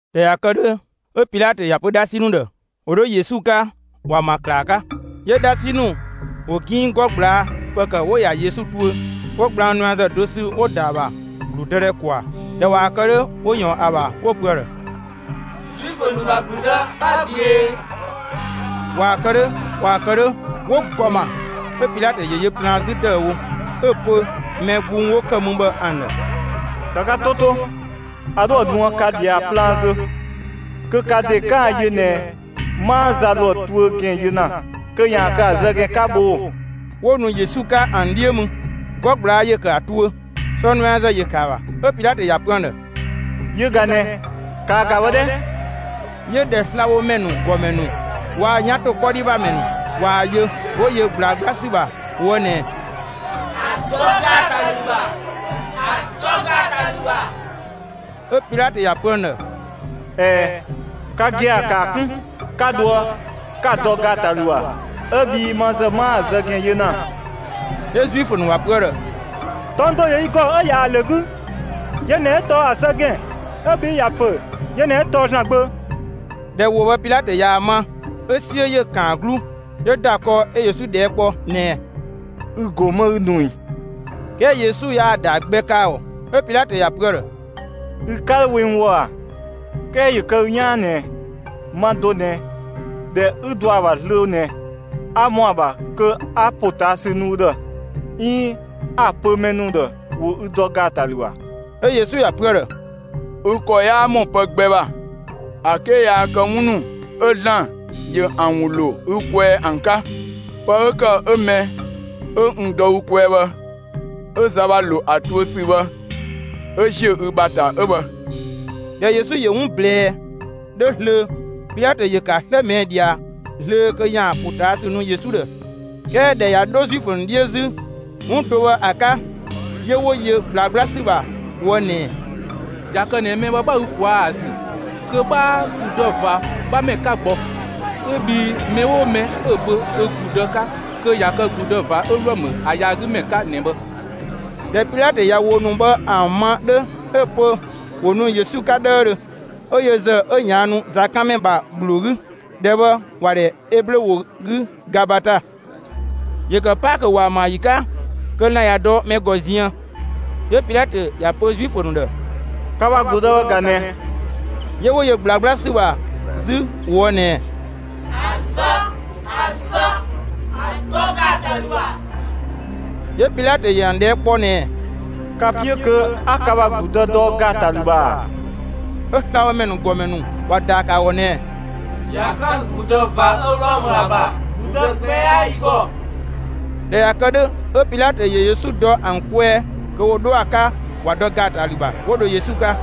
꞊Dhɛ ꞊ya kë 'dhö, 'ö Pilatö ‑ya pö 'dhasi ‑nu ‑dhë ‑wo 'dho Yesu 'ka, ‑wa ‑ma ‑klaa 'ka. 'Yö 'dhasi ‑nu ‑wo 'ginng 'gɔ ꞊gblaa' ‑pë ‑kë 'wo‑ ‑ya Yesu tuö; 'wo gblang nuɛazë do sü 'wo‑ ‑da ‑a ‑bha (‑gludëdhɛ ‑kwaa). ꞊Dhɛ ꞊waa‑ kë 'dhö, 'wo ꞊yɔɔn ‑a ‑bha 'wo‑ pö ‑a ‑dhë: «Zuifö ‑nu ‑bha ‑gludë, 'bha ꞊büee!» ꞊Waa‑ kë 'dhö, ꞊waa‑ kë 'dhö, 'wo‑ ‑gɔ ‑ma. 'Ö Pilatö ‑yö yö plaan 'zü ‑dëüwo, 'ö‑ pö mɛ gbung 'wo ‑kë mü bhë ‑an ‑dhë: «‑Ka ka 'to 'to, a 'dhoë‑ nuë ka ꞊dhia plaan zö kö ka ‑de 'kaan‑ yö ꞊nɛ 'maa za ‑lo ‑a tuö ‑gɛn yö ‑na kö ‑yaan kë ‑a zë ‑gɛn 'ka bhoo‑!» 'Wo nu Yesu 'ka ‑an 'dhiö mü; 'gɔ ꞊gblaa' ‑yö ‑kë ‑a tuö, sɔ nuɛazë ‑yö ‑kë ‑a ‑bha. 'Ö Pilatö ‑ya pö ‑an ‑dhë: «Yö ꞊ga ꞊nɛ! ‑Kaa ‑ga bhë 'dhɛ!» 'Yö ꞊dhɛ slabhomɛ ‑nu ‑gɔmɛ ‑nu waa‑ 'yan ‑to 'kɔdhi ‑bha ‑mɛ ‑nu ꞊waa‑ yö, 'wo yö ꞊gblaa 'gbla ‑sü ‑bha ꞊woë' ꞊nɛɛ: «‑A dɔ ‑gaatalü ‑bha! ‑A dɔ ‑gaatalü ‑bha!» 'Ö Pilatö ‑ya pö ‑an ‑dhë: «꞊Ɛɛ, ka gia‑ ‑kaa 'kun, 'ka dhoë, 'ka‑ dɔ ‑gaatalü ‑bha, 'ö bhii ma ‑zë 'maa‑ zë ‑gɛn yö ‑na.» 'Yö Zuifö ‑nu ‑wa pö ‑a ‑dhë: «Tɔng do ‑yö yi ‑gɔ 'ö ꞊yaa‑ ‑lö 'gü; yö ꞊nɛ 'ö tɔɔ ‑a zë ‑gɛn; 'ö bhii ‑ya pö yö ꞊nɛ 'ö tɔɔ ‑Zlan Gbö.» ꞊Dhɛ ‑wo bhë Pilatö ꞊yaa‑ ma, 'ö 'suö ‑yö ‑kan ‑a 'gluu. 'Yö ‑da kɔɔ 'ö Yesu ꞊dhɛɛ' kpɔ ꞊nɛɛ: «Ü ‑go 'më 'ü nu ꞊ii?» 'Kɛɛ Yesu yaa ‑daa gbɛ kë ‑a ‑gɔ. 'Ö Pilatö ‑ya pö ‑a ‑dhë: «Ü 'ka 'dho we n ꞊woë' ꞊a? 'Kɛɛ ‑yö kë ü 'yaan ꞊nɛ ma do ꞊nɛ, ‑dhɛ 'ü dɔ ‑a ‑bha zlöö ꞊nɛ 'a ‑mɔ ‑a ‑bha kö 'a ‑potaasü nu ü ‑dhë 'iin 'a‑ pö mɛ ‑nu ‑dhë ‑wo ü dɔ ‑gaatalü ‑bha.» 'Ö Yesu ‑ya pö ‑a ‑dhë: «Ü ‑kɔ 'yaa ‑mɔ pë gbɛ ‑bha ‑a 'ke yaa kë 'wun ‑nu 'ö ‑Zlan ‑yö ‑an ‑wun ‑lo ü kwɛɛ ‑an 'ka. Pë 'ö ‑kë 'ö mɛ 'ö n dɔ ü kwɛɛ bhë 'ö za ‑bha ‑lo ‑a tuö ‑sü bhë 'ö ‑ziö ü ‑bha ‑ta 'ö bhë.» ꞊Dhɛ Yesu ‑yö 'wun ꞊blɛɛ 'dhö zlöö, Pilatö ‑yö ‑kë ‑a 'slë ꞊mɛɛ' ꞊dhia zlöö kö ‑yaan ‑potaasü nu Yesu ‑dhë. 'Kɛɛ ꞊dhɛ ꞊ya 'dho Zuifö ‑nu 'dhiö 'zü 'wun do bhë ‑a 'ka 'yö 'wo yö ꞊gblaa 'gbla ‑sü ‑bha ꞊woë' ꞊nɛɛ: «꞊Ya kë ꞊nɛ mɛ bhë 'bha ü ꞊kwaa'‑ ‑a ‑zü, kö 'bhaa ‑gludë ꞊va 'bhamɛ 'ka gbɔ! 'Ö bhii mɛ 'oo mɛ 'ö‑ pö ö ‑gludë 'ka kö ꞊ya kë ‑gludë ꞊va 'ö Wlɔmë bhë ‑a yaagümɛ 'ka ꞊nɛ bhë!» ꞊Dhɛ Pilatö ꞊ya ‑wo ‑nu bhë ‑an ma 'dhö, 'ö‑ pö ‑wo nu Yesu 'ka 'dhëëdhö. 'Ö yö ‑zë 'ö ꞊yaannu zakanmɛ ‑bha ‑gbloo 'gü. ‑Dhɛ bhë ‑wa ‑dhɛ Eblö ‑wo 'gü «Gabata». ‑Yö ‑kë Paakö ‑waamayi 'ka, kö lan‑ ꞊ya dɔ mɛ ‑gɔ ziën. 'Yö Pilatö ‑ya pö Zuifö ‑nu ‑dhë: «Ka ‑bha ‑gludë bhë ꞊ga ꞊nɛ!» 'Yö 'wo yö ꞊gblaa 'gbla ‑sü ‑bha 'zü ꞊woë' ꞊nɛɛ: «‑A zë! ‑A zë! ‑A dɔ ‑gaatalü ‑bha!» 'Yö Pilatö ‑yö ‑an ꞊dhɛɛ' kpɔ ꞊nɛɛ: «Ka‑ 'piö kö 'a ka ‑bha ‑gludë dɔ ‑gaatalü ‑bha ‑a?» 'Ö slabhomɛ ‑nu ‑gɔmɛ ‑nu ‑wa ‑daa ‑kë ‑a ‑gɔ ꞊nɛɛ: «꞊Ya 'kan ‑gludë ꞊va 'ö Wlɔmë ‑a ‑bha, ‑gludë gbɛ 'yaa yi ‑gɔ.» ꞊Dhɛ ꞊ya kë 'dhö, 'ö Pilatö ‑yö Yesu dɔ ‑an kwɛɛ kö ‑wo 'dho ‑a 'ka, ‑wa dɔ ‑gaatalü ‑bha. 'Wo dho Yesu 'ka.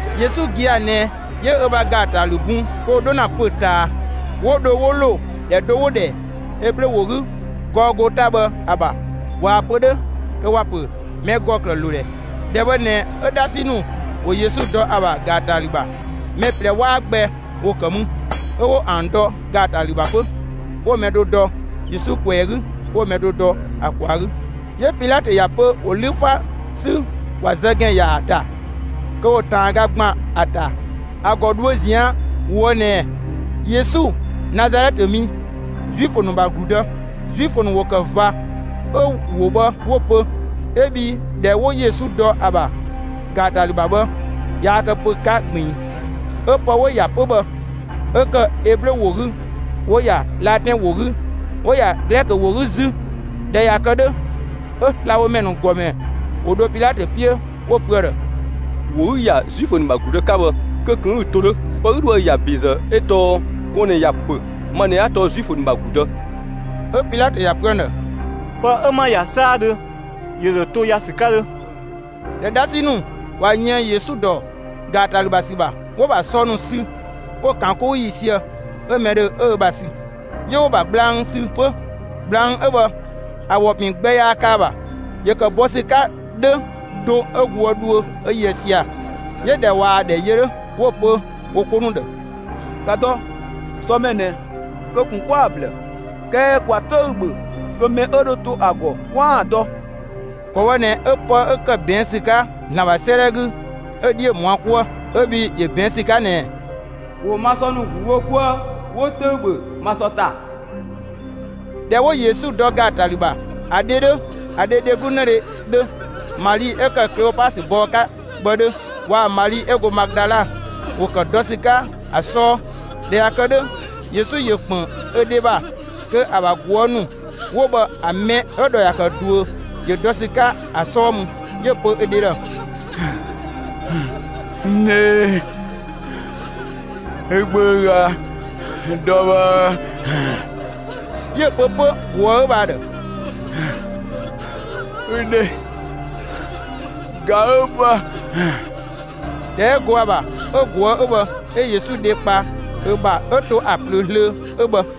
Yesu gia‑ ꞊nɛ 'yö ö ‑bha ‑gaatalü bun kö ‑wo 'dho ‑na pö‑ ꞊taa. 'Wo dho 'wo ‑lo ‑dhɛ do 'wo‑ ‑dhɛ Eblö ‑wo 'gü «Gɔɔgota» bhë ‑a ‑bha (꞊waa‑ pö 'dhö kö ‑wa ‑pö «mɛ ‑gɔ ‑klëë ‑lo ‑dhɛ»). ‑Dhɛ bhë ꞊nɛ 'ö 'dhasi ‑nu ‑wo Yesu dɔ ‑a ‑bha ‑gaatalü ‑bha. Mɛ ꞊plɛ 'waa gbɛ ‑wo ‑kë mü, 'ö 'wo ‑an dɔ ‑gaatalü ‑bha 'pö; 'wo mɛ do dɔ Yesu ꞊kwɛɛ‑ 'gü, 'wo‑ mɛ do dɔ ‑a ꞊kwaa‑ 'gü. 'Yö Pilatö ‑ya pö ‑wo 'lü 'fa 'sü ‑wa zë ‑gɛn ‑yaa ‑ta kö ‑wo ꞊taanga ‑gban ‑a ‑ta ‑a ‑gɔ dhuö zian ꞊woë' ꞊nɛɛ: «Yesu, Nazalɛtë mi, Zuifö ‑nu ‑bha ‑gludë.» Zuifö ‑nu ‑wo ‑kë ꞊va 'ö ‑wo bhë 'wo‑ pö 'ö bhii ‑dhɛ 'wo Yesu dɔ ‑a ‑bha ‑gaatalü ‑bha bhë, yaa kë pö‑ 'ka ꞊gbiin; 'ö pë 'wo‑ ‑ya 'pö bhë 'ö ‑kë Eblö ‑wo 'gü, 'wo‑ ‑ya Latɛn ‑wo 'gü, 'wo‑ ‑ya Glɛkö ‑wo 'gü 'zü. ꞊Dhɛ ꞊ya kë 'dhö, 'ö slabhomɛ ‑nu ‑gɔmɛ ‑wo dho Pilatö 'piö 'wo‑ pö ‑a ‑dhë: «‑Wo 'ü‑ ‑ya ‹Zuifö ‑nu ‑bha ‑gludë› 'ka bhë, kö ꞊kun 'ü‑ to 'dhö; pë 'ü dhoë‑ ‑ya ‑be 'ö tɔɔ ‹gɔɔn‑ ꞊nɛ ‑ya ‑pö: Ma ꞊nɛ 'a tɔɔ Zuifö ‑nu ‑bha ‑gludë›.» 'Ö Pilatö ‑ya pö ‑an ‑dhë: «Pë 'ö 'ma‑ ‑ya 'saadhö, ‑yö ‑dho to ‑ya ‑sü 'ka 'dhö!» ꞊Dhɛ 'dhasi ‑nu ꞊wa yën Yesu ‑dɔ ‑gaatalü ‑bha ‑sü ‑bha, 'wo‑ ‑bha sɔ ‑nu sü 'wo‑ ‑kan 'kou ‑yiisië, 'ö mɛ 'ö ‑dhö 'ö ö ‑bha sü. 'Yö 'wo‑ ‑bha gblang sü 'pö. Gblang 'ö bhë ‑a ‑wɔ ‑pin gbɛ yaa kë ‑a ‑bha. ‑Yö ‑kë bɔ ‑sü 'ka 'dhö do 'ö goë dhuö 'ö yöë sia‑. 'Yö ꞊dhɛ ꞊waa‑ ‑dhɛ yö 'dhö, 'wo‑ pö wo 'ko ‑nu ‑dhë: «‑Ka dɔ; sɔ mɛ ꞊nɛ, kö ꞊kun 'kwa‑ ‑blë, 'kɛɛ ‑kwa 'töü‑ ‑bhö kö mɛ 'ö dho to ‑a ‑gɔ, 'kwaan‑ dɔ.» ‑Kɔ bhë ꞊nɛ 'ö pë 'ö ‑kë ꞊bɛɛn' ‑sü 'ka ‑Zlan ‑bha 'sëëdhɛ 'gü, 'ö‑ 'dhiö ‑mɔ ‑a 'ka 'kuë, 'ö bhii ‑yö ꞊bɛɛn' ‑sü 'ka ꞊nɛɛ: ‑Wo ma sɔ ‑nu ‑glu wo 'kuë, 'wo 'töü‑ ‑bhö ma sɔ ‑ta. ꞊Dhɛ 'wo Yesu dɔ ‑gaatalü ‑bha, ‑a dhe 'dhö, ‑a dhe dheglu 'nëdhe 'dhö, Mali 'ö ‑kë Kleopasö bɔɔ 'ka bhë 'dhö, waa‑ Mali 'ö go Madala ‑wo ‑kë dɔ ‑sü 'ka ‑a 'sɔɔ. ꞊Dhɛ ꞊ya kë 'dhö, Yesu ‑yö ‑kpën ö dhe ‑bha kö ‑a ‑bha ꞊guë' ‑nu 'wo bhë ‑a mɛ 'ö‑ ‑dhɔ ‑ya ‑kë ꞊duö ‑yö dɔ ‑sü 'ka ‑a 'sɔɔ mü, 'yö‑ pö ö dhe ‑dhë: «N dhe, ü gbö ꞊ga dɔ bhë.» 'Yö‑ pö 'pö ꞊guë' 'ö bhë ‑a ‑dhë: «Ü dhe ꞊ga 'ö bhë.» ‑Dhɛ 'ö go ‑a ‑bha 'ö ꞊guë' 'ö bhë 'ö Yesu dhe kpa ö ‑bha, 'ö to ‑a ꞊plöö zlöö 'ö bhë.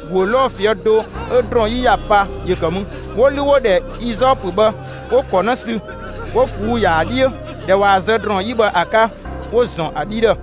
‑Guö 'lɔɔ‑ ꞊fië' do 'ö ‑drɔɔn 'yi ‑ya pa ‑yö ‑kë mü. 'Wo 'lü 'wo‑ ‑dhɛ izɔpö bhë 'wo‑ ‑kɔ 'në sü, 'wo ꞊fuu'‑ ‑ya ‑a 'dhiö. ꞊Dhɛ ꞊waa‑ zë ‑drɔɔn 'yi bhë ‑a 'ka, 'wo‑ ‑zɔn ‑a 'dhi ‑dhë,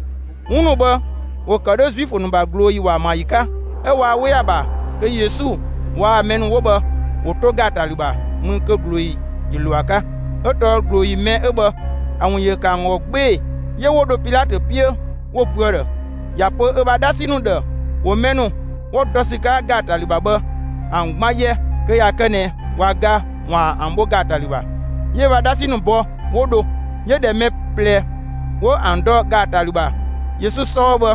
'Wun ‑nu bhë ‑wo ‑kë 'dhö Zuifö ‑nu ‑bha ꞊glooyi ‑waamayi 'ka, 'ö waa 'we ‑a ‑bha kö Yesu waa‑ mɛ ‑nu 'wo bhë ‑wo 'to ‑gaatalü ‑bha mü kö ꞊glooyi ‑yö ‑lo ‑a 'ka; 'ö tɔɔ ꞊glooyi mɛ 'ö bhë ‑a ‑wun ‑yö ‑kë ‑an ‑gɔ 'gbee‑. 'Yö 'wo dho Pilatö 'piö 'wo‑ pö ‑a ‑dhë ‑ya pö ö ‑bha 'dhasi ‑nu ‑dhë ‑wo mɛ ‑nu 'wo dɔ ‑sü 'ka ‑gaatalü ‑bha bhë ‑an 'gban 'yɛ, kö ꞊ya kë ꞊nɛ ꞊wa ga, ‑waan ‑an bho ‑gaatalü ‑bha. 'Yö ö ‑bha 'dhasi ‑nu bɔ, 'wo dho; 'yö ꞊dhɛ mɛ ꞊plɛ 'wo ‑an dɔ ‑gaatalü ‑bha Yesu 'sɔɔ bhë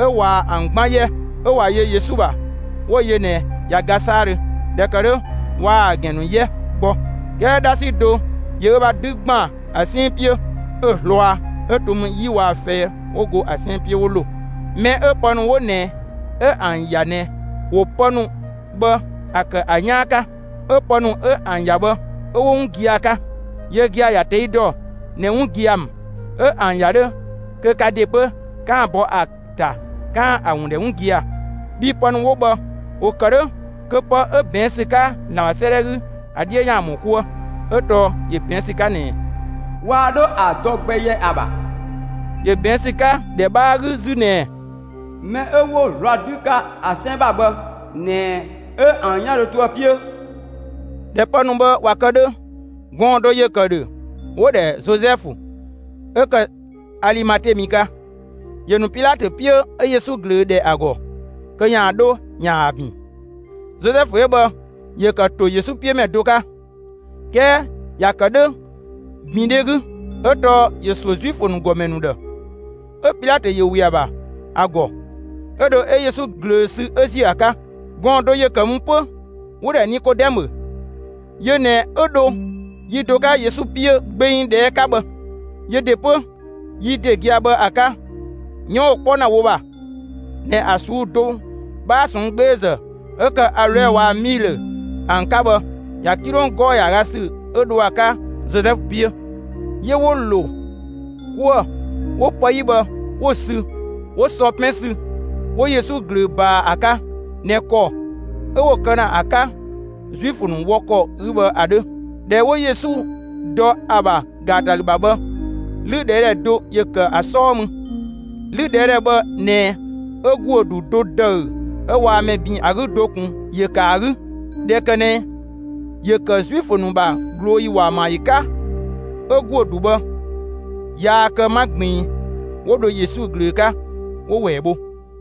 'ö ꞊wa ‑an 'gban 'yɛ. 'Ö ꞊wa yö Yesu ‑bha, 'wo‑ yö ꞊nɛ ꞊ya ga 'saadhö. ꞊Dhɛ ‑kë 'dhö, waa‑ ‑a ‑gɛn ‑nu 'yɛ gbɔ. 'Kɛɛ 'dhasi do ‑yö ö ‑bha 'dü ‑gban ‑a 'sɛn 'piö 'ö‑ zlɔa 'Ö to mü 'yi waa‑ fɛi 'wo go ‑a 'sɛn 'piö 'wo ‑lo. Mɛ 'ö pë ‑nu 'wo ꞊nɛ 'ö ‑an ‑ya ꞊nɛ, ‑wo pë ‑nu bhë ‑a ‑kë ‑a 'yaan 'ka; 'ö pë ‑nu 'ö ‑an ‑ya bhë, 'ö 'wo 'wun gia‑ 'ka. Yö gia‑ ‑ya ꞊tɛi' dɔ ꞊nɛ 'wun gia‑ ‑mü. 'Ö ‑an ‑ya 'dhö kö ka ‑de 'pö 'kaan‑ bɔ ‑a ‑ta 'kaan‑ ‑a ‑wun ‑dhɛ 'wun gia‑. Bhii pë ‑nu 'wo bhë ‑wo kë 'dhö kö pë 'ö ꞊bɛɛn' ‑sü 'ka ‑Zlan ‑bha 'sëëdhɛ 'gü ‑a 'dhiö ‑yaan ‑mɔ 'kuë. 'Ö tɔɔ ‑yö ꞊bɛɛn' ‑sü 'ka ꞊nɛɛ: Waa 'dho ‑a dɔ gbɛ yɛ ‑a ‑bha. 'Yö ꞊bɛɛn' ‑sü 'ka ‑dhɛ 'bhaa 'gü 'zü ꞊nɛɛ: Mɛ 'ö 'wo‑ zlɔa 'dü 'ka ‑a 'sɛn ‑bha bhë ꞊nɛ 'ö ‑an 'yan dho to ‑a 'piö. ꞊Dhɛ pë ‑nu bhë ꞊wa kë 'dhö, gɔɔn‑ do ‑yö ‑kë ‑dhö 'wo‑ ‑dhɛ Zozɛfu, 'ö ‑kë Alimate mi 'ka; ‑yö ‑nu Pilatö 'piö 'ö Yesu ꞊glöö ‑dhɛ ‑a ‑gɔ kö ‑yaan 'dho ‑yaan ‑a ‑bin. Zozɛfu 'ö bhë ‑yö ‑kë ‑to Yesu 'piö ‑mɛ do 'ka, 'kɛɛ ‑ya ‑kë 'dhö ‑bindhɛ 'gü, 'ö tɔɔ ‑yö ‑suö Zuifö ‑nu ‑gɔmɛ ‑nu ‑dhë. 'Ö Pilatö ‑yö ‑we ‑a ‑bha ‑a ‑gɔ. 'Ö dho 'ö Yesu ꞊glöö sü 'ö ‑ziö ‑a 'ka. Gɔɔn‑ do ‑yö ‑kë mü 'pö 'wo‑ ‑dhɛ Nikodɛmö. Yö ꞊nɛ 'ö dho yi do 'ka Yesu 'piö gbeng ꞊dhɛɛ' 'ka bhë. Yö ‑de 'pö, yi ‑de gia‑ bhë ‑a 'ka, 'yɔn 'wo‑ 'kpɔ ‑na wo ‑bha ꞊nɛ ‑a ꞊suu'‑ do 'bhaa ꞊sɔnng' 'gbeezë 'ö ‑kë aloɛ waa‑ 'miilö ‑an 'ka bhë, ‑ya 'kilong 'gɔɔ‑ ‑yaaga ‑sü 'ö dho ‑a 'ka Zozɛfu 'piö. 'Yö 'wo ‑lo 'kuë‑ 'wo pë 'yi bhë 'wo‑ sü, 'wo sɔ 'pɛn sü, 'wo Yesu ꞊glöö ꞊baa ‑a 'ka ꞊nɛ ‑kɔ 'ö 'wo‑ kë ‑na ‑a 'ka Zuifö ‑nu wɔ ‑kɔ 'gü bhë ‑a 'dhö. ꞊Dhɛ 'ö 'wo Yesu dɔ ‑a ‑bha ‑gaatalü ‑bha bhë, 'lüdhɛɛdhɛ do ‑yö ‑kë ‑a 'sɔɔ mü. 'Lüdhɛɛdhɛ bhë ꞊nɛ 'ö ‑guö ‑du do ‑dëü 'ö waa mɛ ‑bin ‑a 'gü do ꞊kun ‑yö ‑kë ‑a 'gü. ꞊Dhɛ ‑kë ꞊nɛ ‑yö ‑kë Zuifö ‑nu ‑bha ꞊glooyi ‑waamayi 'ka, 'ö ‑guö ‑du bhë yaa kë 'ma ꞊gbiin, 'wo dho Yesu ꞊glöö 'ka 'wo‑ ‑wɛɛ bho.